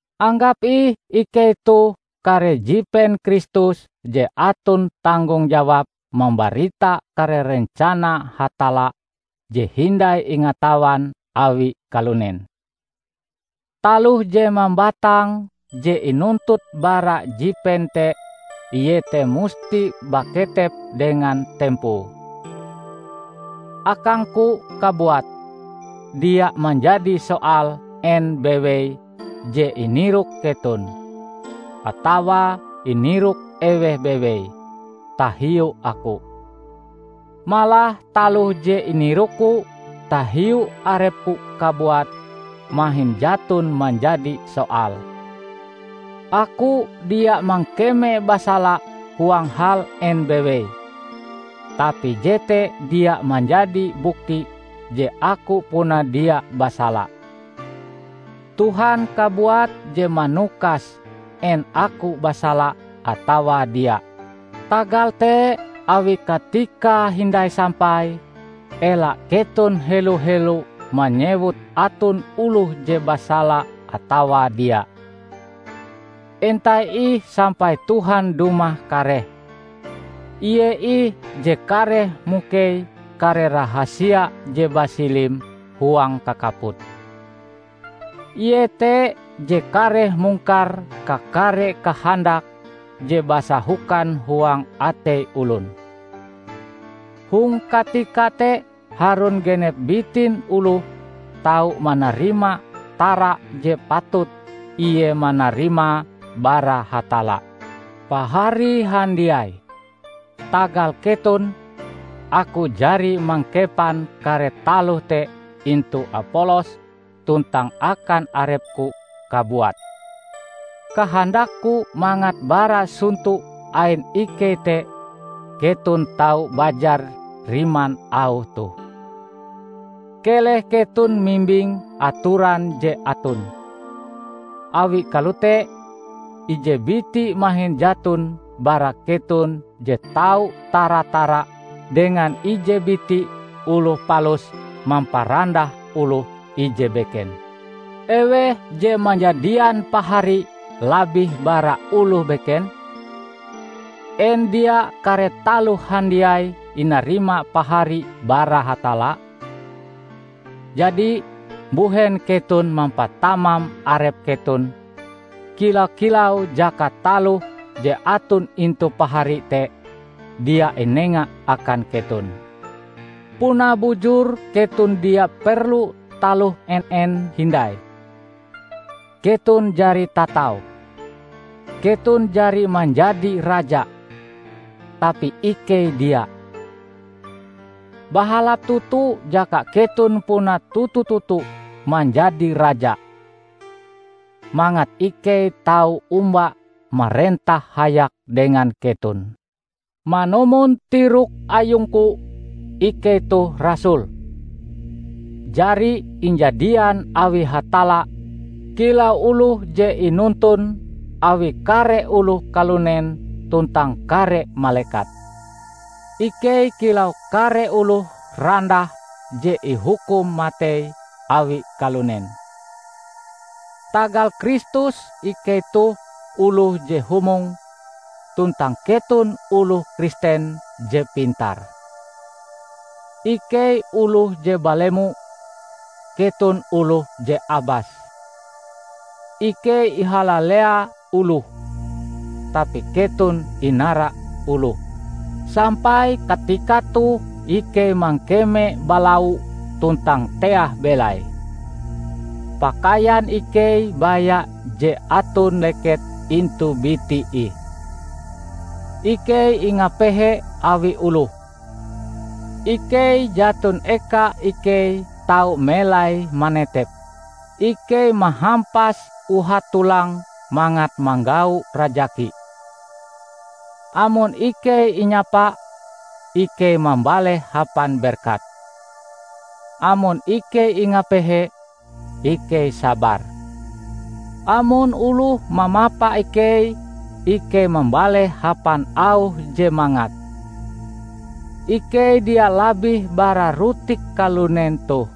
Anggap ih ikei toh kare jipen Kristus je aton tanggong jawab mambarita kare rencana Hatalla je hindai ingatawan awi kalunen. Taloh je mambatang je inuntut bara jipen te iete musti baketep dengan tempoe. Akangku kabuat, dia manjadi soal en bewei je inirok keton -- atawa inirok eweh bewei -- tahiu aku. Malah taloh je inirokku tahiu arepku kabuat mahin jaton manjadi soal. Aku dia mangkeme basala huang hal en bewei, tapi jete dia manjadi bukti je aku puna dia basala. Tuhan kabuat je manukas en aku basala atawa dia. Tagal te, awi katikae hindai sampai, ela keton helo-helo manyewut aton oloh je basala atawa dia. Entai ih sampai Tuhan dumah kareh. Ie ih je kareh mukei kare rahasia je basilim huang kakaput. Ie te je kareh mungkar kakare kahandak je basahokan huang atei olon. Hong katika te harun genep bitin oloh tau manarima tara je patut ie manarimae bara Hatalla. Pahari handiai! Tagal keton, aku jari mangkepan kare taloh te intu Apolos tuntang akan arepku kabuat. Kahandakku mangat bara sonto ain ikei te keton tau bajar riman auh toh, "Keleh keton mimbing atoran je aton." Awi kalote, ije biti mahin jaton bara keton je tau tara-tara dengan ije biti oloh palus mamparandah oloh ije beken. Eweh je manjadian pahari labih bara oloh beken? En dia kare taloh handiai inarima pahari bara Hatalla? Jadi, mbuhen keton mampatamam arep keton, kila-kilau jaka taloh je aton intu pahari te dia inenga akan keton? Puna bujur keton dia perlu taloh en-en hindai. Keton jari tatau! Keton jari manjadi raja! Tapi ikei dia. Bahalap toto jaka keton puna toto-toto manjadi raja, mangat ikei tau omba marentah hayak dengan keton. Manumon tirok ayungku, ikei toh rasul, jari injadian awi Hatalla kilau oloh je inonton awi kare oloh kalunen tuntang kare malekat. Ikei kilau kare oloh randah je ihukum matei awi kalunen. Tagal Kristus ikei toh oloh je humong, tuntang keton oloh Kristen je pintar! Ikei oloh je balemo, keton oloh je abas! Ikei ihalalea oloh, tapi keton inara oloh! Sampai katika toh ikei mangkeme balau tuntang teah belai; pakaian ikei baya je aton leket intu biti ih; ikei ingapehe awi oloh; ikei jaton eka ikei tau melai manetep; ikei mahampas uhat-tolang mangat manggau rajaki. Amon ikei inyapa, ikei mambaleh hapan berkat; amon ikei ingapehe, ikei sabar; amon oloh mamapa ikei, ikei mambaleh hapan auh je mangat. Ikei dia labih bara rutik kalunen toh;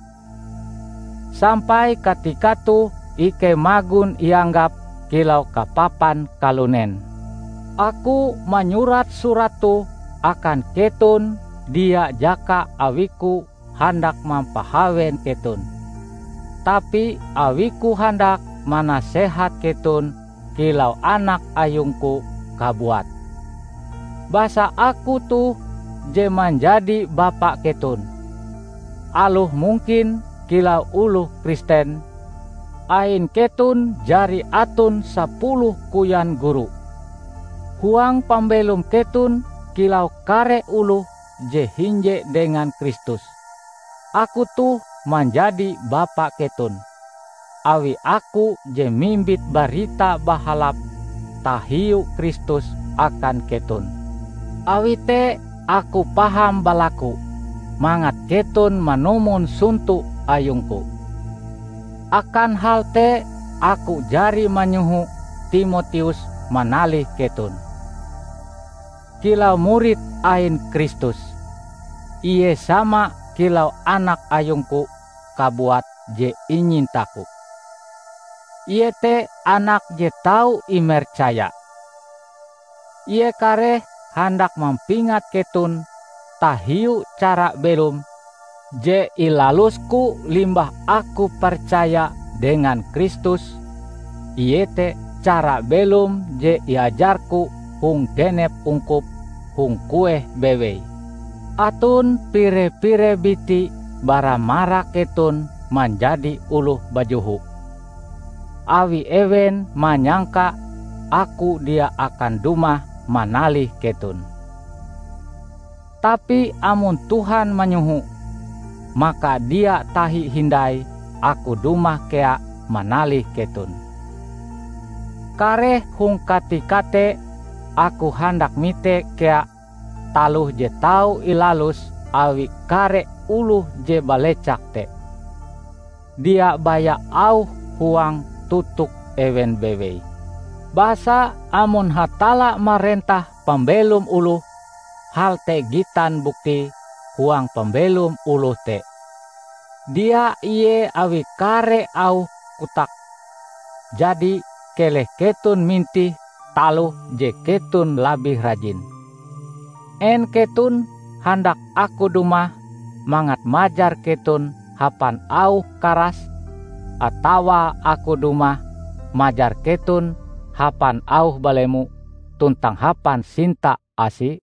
sampai katika toh ikei magon ianggap kilau kapapan kalunen. Aku manyurat surat toh akan keton dia jaka awiku handak mampahawen keton, tapi awiku handak manasehat keton kilau anak ayungku kabuat. Basa aku toh je manjadi bapa keton, aloh mungkin kilau oloh Kristen, ain keton jari aton sapuloh koyan guru. Huang pambelom keton kilau kare oloh je hinje dengan Kristus, aku toh manjadi bapa keton, awi aku je mimbit Barita Bahalap tahiu Kristus akan keton. Awi te aku paham balaku mangat keton manumon sonto ayungku. Akan hal te aku jari manyoho Timoteus manalih keton. Kilau murid ain Kristus, ie sama kilau anak ayungku kabuat je inyintaku. Ie te anak je tau imercaya. Ie kareh handak mampingat keton tahiu cara belom je ilalusku limbah aku percaya dengan Kristus, iete cara belom je iajarku hong genep ungkup hong kueh bewei. Aton pire-pire biti bara marak keton manjadi oloh bajoho, awi ewen manyangka aku dia akan dumah manalih keton. Tapi amon Tuhan manyoho, maka dia tahi hindai aku dumah kea manalih keton. Kareh hong katika te aku handak mite kea taloh je tau ilalus awi kare oloh je balecak te; dia baya auh huang totok ewen bewei. Basa amon Hatalla marentah pambelom oloh, hal te gitan buktie huang pambelom oloh te, dia ie awi kare auh kotake. Jadi keleh keton mintih taloh je keton labih rajin! En keton handak aku dumah mangat majar keton hapan auh karas atawa aku dumah majar keton hapan auh balemo tuntang hapan sinta-asi?